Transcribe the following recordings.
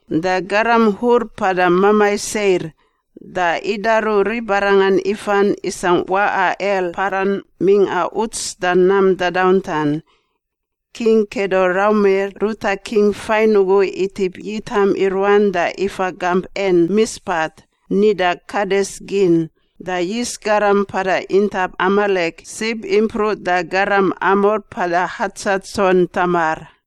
da garam Hur mpada mamai Seir, da idaru ribarangan ifan isangꞌ waꞌa El Paran mingꞌa uts da nam dadauntan. King Kedoraumer ruta king fain ugu itip yitam i ruan da ifa gamp En Mispat (nida Kades gin) da yis garam mpada intap Amalek sib impruꞌ da garam Amor mpada Hatsatson Tamar.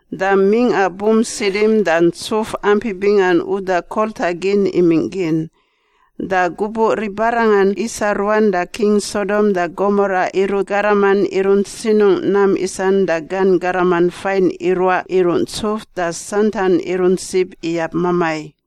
Da mingꞌa Bump Sidim da ntsuf ampi bingan uda kolta gin imingꞌ gin. Da gubuꞌ ribarangan isa ruan da king Sodom da Gomora irut garaman irunt sinungꞌ nam isan da gan garaman fain iruaꞌ iruꞌ ntsuf da santan irunt sib iyab mamai.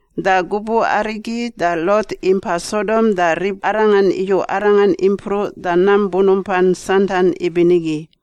Da gubuꞌ arigi da Lot impa Sodom da ribarangan iyu arangan impruꞌ da nam bunumpan santan ibinigi.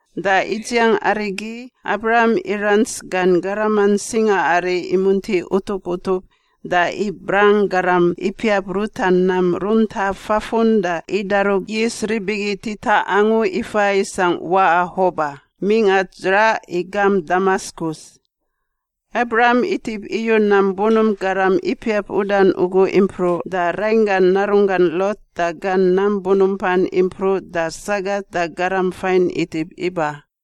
Da idziang arigi, Abram irants gan garaman singaari imunti utup utup da ibrang garam ipiap ruta nam runta fafun da idaru yis rib igi titaꞌ angu ifa isangꞌ waꞌa Hoba, mingꞌa dzraꞌ i gamp Damaskus. Abram itip iyu nam bunump garam ipiap udan ugu impruꞌ da rainggan narunggan Lot da gan nam bunumpan impruꞌ da sagat da garam fain itip iba.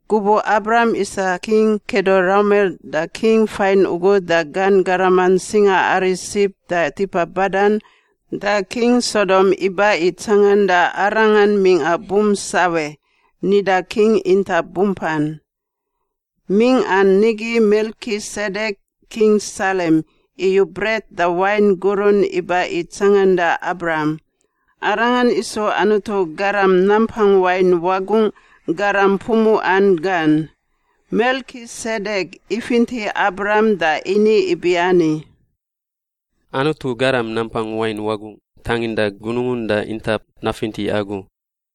Gubuꞌ Abram isa King Kedoraumer da king fain ugu da gan garaman singaari sib da tipa badan, da king Sodom iba i tsanganda arangan mingꞌa Bump Sawe (nida King Intap Bumpan). Mingꞌan nigi Melkisedek, king Salem, iyu bret da wain gurun iba i tsanganda Abram. Arangan isu Anutu Garam Nampang Wain Wagungꞌ garam pumuꞌan gan. Melkisedek ifinti Abram da ini ibiani, “Anutu Garam Nampang Wain Wagungꞌ tanginda gunungun da intap nafinti agu.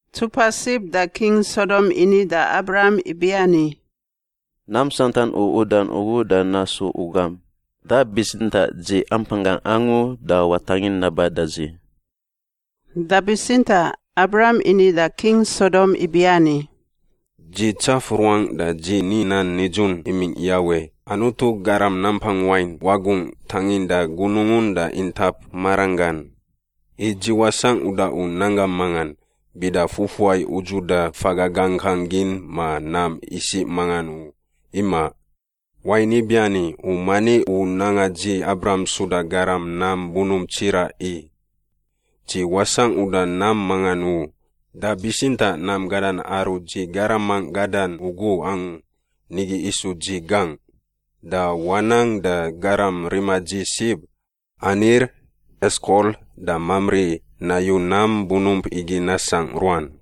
Ntsupa sib da king Sodom ini da Abram ibiani, “Nam santan u udan ugu da nasu u gam, da bitsintaꞌ dzi ampanggangꞌ angu da watangin naba da dzi.” Da bitsintaꞌ Abram ini da king Sodom ibiani, “Dzi tsaf ruangꞌ da dzi ni nan nidzun imingꞌ Yawe, Anutu Garam Nampang Wain Wagungꞌ tanginda gunungun da intap maranggan, i dzi wasangꞌ uda u nanggam mangan, bida fufuai udzuda faga gangkang gin ma nam isiꞌ mangan u, imaꞌ. Wain ibiani, u mani u nanga dzi Abram suda garam nam bunump tsiraꞌ i. Dzi wasangꞌ uda nam mangan u, da bitsintaꞌ nam gadan aru dzi garamangꞌ gadan ugu angu, nigi isu dzi gangꞌ. Da wanang da garam rima dzi sib, Anir, Eskol, da Mamri nayu nam bunump igi nasangꞌ ruan.”